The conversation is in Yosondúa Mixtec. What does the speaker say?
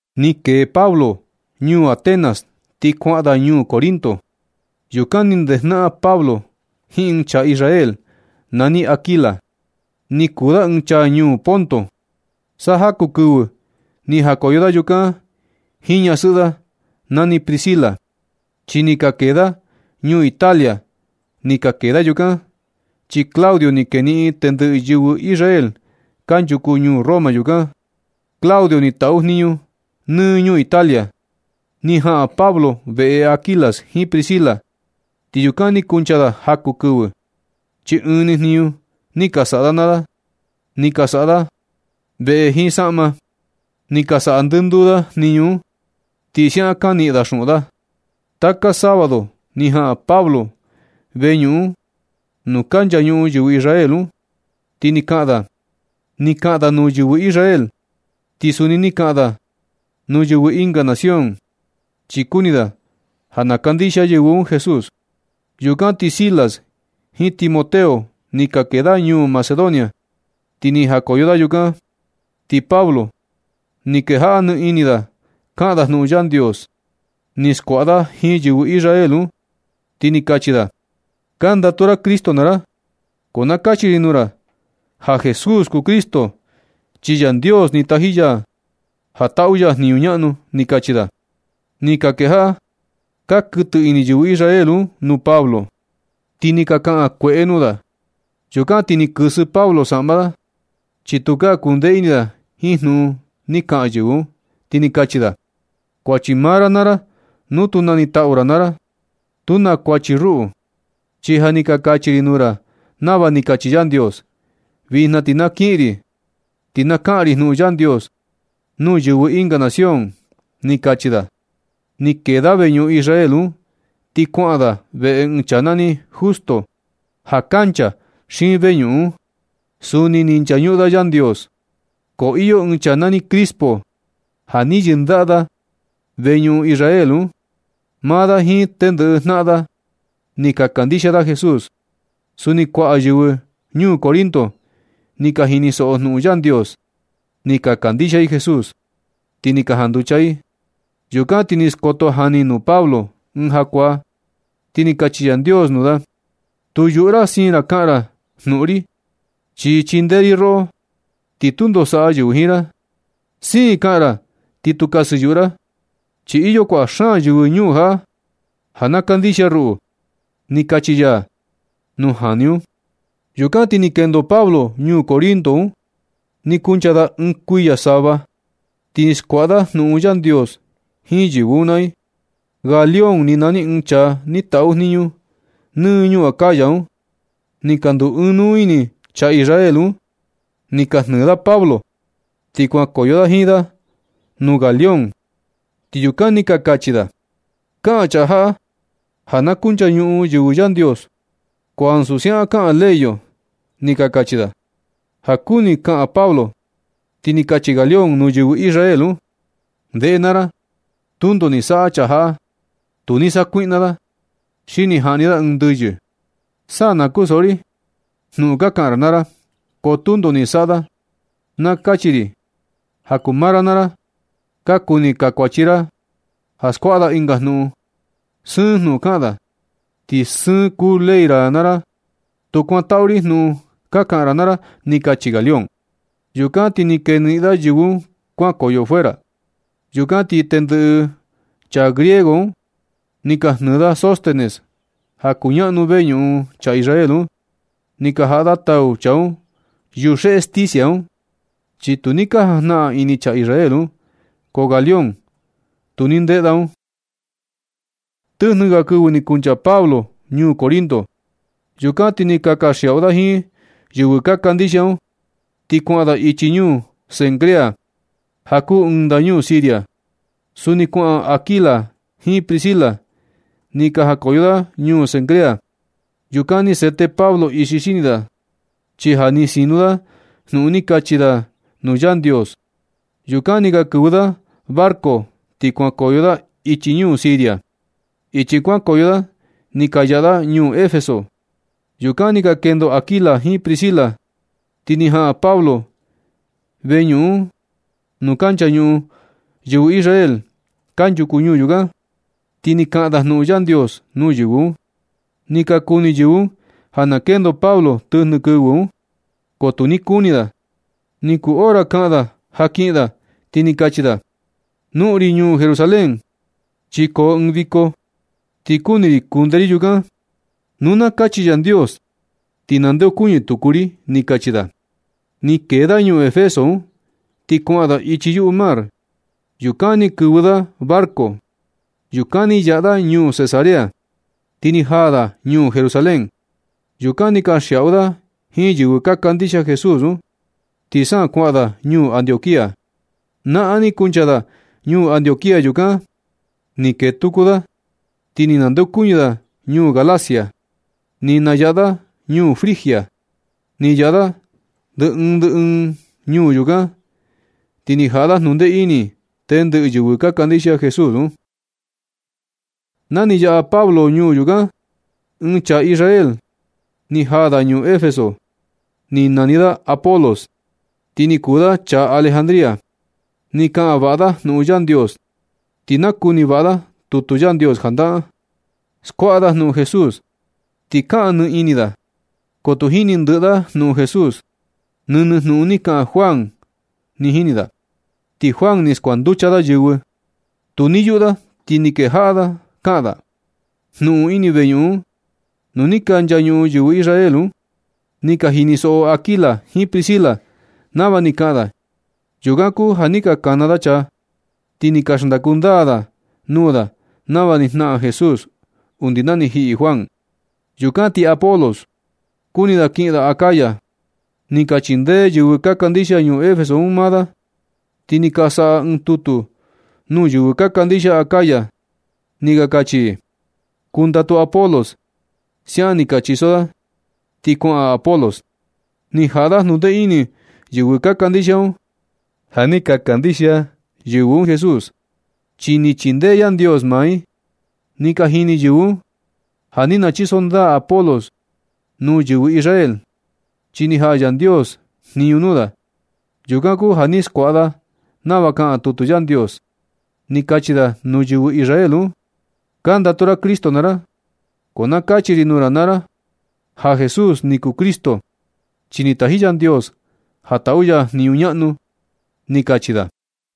Ni kee Pablo ñuu Atenas ti kuaꞌan da ñuu Corinto. Yukan ni ndejnaꞌan Pablo jiin ɨɨn chaa Israel nani Aquila. Ni kuu da ɨɨn chaa ñuu Ponto. Sa jaku kɨvɨ ni jakoyo da yukan jiin ñasɨꞌɨ da nani Priscila, chi ni ka kee da ñuu Italia. Ni ka kee da yukan, chi Claudio ni keniꞌin tendɨꞌɨ yɨvɨ Israel kanchuku ñuu Roma yukan. Claudio ni taꞌu jniñu nɨ ñuu Italia. Ni jaꞌan Pablo veꞌe Aquila jiin Priscila. Ti yukan ni kuncha da jaku kɨvɨ, chi ɨɨn ni jniñu ni ka saꞌa da naa da. Ni ka saꞌa da veꞌe jiin saꞌma. Ni ka saꞌa ndɨnduu da jniñu un, ti siaꞌan ka niꞌin da xuꞌun da. Taka sábado ni jaꞌan Pablo veñuꞌun nuu ka nchañuꞌun yɨvɨ Israel un, ti ni kaꞌan da. Ni kaꞌan da nuu yɨvɨ Israel, ti suni ni kaꞌan da nuu yɨvɨ ɨnga nación, chi kuni da ja na kandixia yɨvɨ un Jesús. Yukan ti Silas jiin Timoteo ni ka kee da ñuu Macedonia, ti ni jakoyo da yukan. Ti Pablo ni kejaꞌa nɨ ini da kaꞌan da jnuꞌun Yandios. Ni skuaꞌa da jiin yɨvɨ Israel un, ti ni kachi da: ―Kandatu ra Cristo naa ra. Ko na kachi ri nuu ra ja Jesús kuu Cristo, chi Yandios ni taji ya ja taꞌu ya jniñu ñaꞌnu ―ni kachi da. Ni ka kejaꞌa ka kuɨtɨ ini yɨvɨ Israel un nuu Pablo, ti ni ka kaꞌan kueꞌe da nuu da. Yukan ti ni kɨsɨ Pablo saꞌma da, chi tukaa kundee ini da jiin jnuꞌun ni ka kaꞌan yɨvɨ un, ti ni kachi da: ―Kuachi maa ra naa ra nu tu nanitaꞌu ra naa ra. Tu na kuachi ruꞌu, chi ja ni ka kachi ri nuu na nava ni kachi Yandios. Vijna ti na kiꞌin ri, ti na kaꞌan ri jnuꞌun Yandios nuu yɨvɨ ɨnga nación ―ni kachi da. Ni kee da veñuꞌun Israel un, ti kuaꞌan da veꞌe ɨɨn chaa nani Justo, ja kancha xiin veñuꞌun un. Suni ni nchañuꞌun da Yandios. Ko iyo ɨɨn chaa nani Crispo ja ni yɨndaꞌa veñuꞌun Israel un. Maa da jiin tendɨꞌɨ jnaꞌan da ni ka kandixia da Jesús. Suni kuaꞌa yɨvɨ ñuu Corinto ni ka jinisoꞌo jnuꞌun Yandios, ni ka kandixia i Jesús, ti ni ka janducha i. Yukan ti ni skoto jani nuu Pablo ɨɨn jakuaa, ti ni kachi Yandios nuu da: Tu yuꞌu ra siin ra kaꞌan ra jnuꞌun ri, chi chindee ri roꞌo, ti tundo saꞌa yɨvɨ jiin ra. Siin kaꞌan ra ti tu kasɨyuꞌu ra, chi iyo kuaꞌa xaan yɨvɨ ñuu jaꞌa ja na kandixia ruꞌu ―ni kachi ya nuu jani un. Yukan ti ni kendo Pablo ñuu Corinto un ni kuncha da ɨɨn kuiya sava, ti ni skuaꞌa da jnuꞌun Yandios jiin yɨvɨ un naa i. Galión ni nani ɨɨn chaa ni taꞌu jniñu nɨ ñuu Acaya un. Ni ka nduu ɨɨn nuu ini chaa Israel un, ni ka jnɨɨ da Pablo ti kuankoyo da jiin da nuu Galión. Ti yukan ni ka kachi da: ―Kaꞌan chaa jaꞌa ja na kunchañuꞌun yɨvɨ Yandios, ko ansu siaꞌan kaꞌan ley yo ―ni ka kachi da. Ja kuni kaꞌan Pablo, ti ni kachi Galión nuu yɨvɨ Israel un: ―Ndeꞌe naa ra, tundo ni saꞌa chaa jaꞌa. Nu ni sakuiꞌna da, xi ni jaꞌni da ɨɨn ndɨyɨ, sa na kunsoꞌo ri jnuꞌun ka kaꞌan ra naa ra, ko tundo ni saꞌa da. Na kachi ri ja kuu maa ra naa ra. Ka kuni chakuachi ra da ja skuaꞌa da ɨnga jnuꞌun. Sɨɨn jnuꞌun kaꞌan da, ti sɨɨn kuu ley ra naa ra. Tu kuantaꞌu ri jnuꞌun ka kaꞌan ra naa ra ―ni kachi Galión. Yukan ti ni keniꞌin da yɨvɨ un kuankoyo fuera. Yukan ti tendɨꞌɨ chaa griego un ni ka jnɨɨ da Sóstenes ja kuñaꞌnu veñuꞌun chaa Israel un, ni ka jaꞌa da tau chaa un yuxeꞌe sticia un, chi tu ni ka jajnaꞌan ini chaa Israel un, ko Galión tu ni ndeꞌe da un. Tɨjnɨ ga kɨvɨ ni kuncha Pablo ñuu Corinto. Yukan ti ni ka kanxiaꞌu da jiin yɨvɨ ka kandixia un, ti kuaꞌan da ichi ñuu Cencrea, ja kuu ɨɨn ndañuu Siria. Suni kuaꞌan Aquila jiin Priscila. Ni ka jakoyo da ñuu Cencrea. Yukan ni sete Pablo ixi xini da, chi ja ni sinu da jnuꞌun ni kachi da nuu Yandios. Yukan ni ka kɨvɨ da barco ti kuankoyo da ichi ñuu Siria. Ichi kuankoyo da ni ka yaꞌa da ñuu Efeso. Yukan ni ka kendo Aquila jiin Priscila, ti ni jaꞌan Pablo veñuꞌun nuu ka nchañuꞌun yɨvɨ Israel kanchuku ñuu yukan, ti ni kaꞌan da jnuꞌun Yandios nuu yɨvɨ un. Ni ka kuni yɨvɨ un ja na kendo Pablo tɨjnɨ kɨvɨ un, ko tu ni kuni da. Ni kuu hora kaꞌan da ja kiꞌin da, ti ni kachi da: ―Noꞌon ri ñuu Jerusalén, chi koo ɨɨn viko, ti kuni ri kunde ri yukan. Nu na kachi Yandios ti nandeokuñɨ tuku ri ―ni kachi da. Ni kee da ñuu Efeso un, ti kuaꞌan da ichi yuꞌu mar. Yukan ni kɨvɨ da barco. Yukan ni yaꞌa da ñuu Cesarea, ti ni jaa da ñuu Jerusalén. Yukan ni kanxiaꞌu da jiin yɨvɨ ka kandixia Jesús un, ti sa kuaꞌan da ñuu Antioquía. Naꞌan ni kuncha da ñuu Antioquía. Yukan ni kee tuku da, ti ni nandeokuñɨ da ñuu Galacia. Ni nayaꞌa da ñuu Frigia. Ni yaꞌa da ndɨ ɨɨn ndɨ ɨɨn ñuu yukan, ti ni jaꞌa da jnundee ini tendɨꞌɨ yɨvɨ ka kandixia Jesús un. Na ni yaꞌa Pablo ñuu yukan, ɨɨn chaa Israel ni jaa da ñuu Efeso. Ni nani da Apolos, ti ni kuu da chaa Alejandría. Ni kaꞌan vaꞌa da jnuꞌun Yandios, ti nakuni vaꞌa da tutu Yandios janaꞌan. Skuaꞌa da jnuꞌun Jesús. Ni kaꞌan nɨ ini da, ko tu jini ndɨꞌɨ da jnuꞌun Jesús. Nɨnɨ jnuꞌun ni kaꞌan Juan ni jini da, ti Juan ni skuanducha da yɨvɨ. Tu ni yuꞌu da ti ni kejaꞌa kaꞌan da jnuꞌun un ini veñuꞌun nuu ni ka nchañuꞌun yɨvɨ Israel un. Ni ka jinisoꞌo Aquila jiin Priscila nava ni kaꞌan da. Yukan kuu ja ni ka kana da chaa, ti ni ka xndaku ndaa da nuu da nava ni jnaꞌan Jesús undi na ni jiꞌi Juan. Yukan ti Apolos kuni da kiꞌin da Acaya. Ni ka chindee yɨvɨ ka kandixia ñuu Efeso un maa da, ti ni ka saꞌa i ɨɨn tutu nuu yɨvɨ ka kandixia Acaya. Ni ka kachi i: “Kuantaꞌu Apolos.” Siaꞌan ni ka chiso da, ti kuaꞌan Apolos. Ni jaꞌa da jnundee ini yɨvɨ ka kandixia un. Ja ni ka kandixia yɨvɨ un Jesús, chi ni chindee Yandios maa i. Ni ka jini yɨvɨ un ja ni nachiso ndaa Apolos nuu yɨvɨ Israel, chi ni jaꞌa Yandios jniñu nuu da. Yukan kuu ja ni skuaꞌa da nava kaꞌan tutu Yandios. Ni kachi da nuu yɨvɨ Israel un: ―Ka ndatu ra Cristo naa ra. Ko na kachi ri nuu ra ja Jesús ni kuu Cristo, chi ni taji Yandios ja taꞌu ya jniñu ñaꞌnu ―ni kachi da.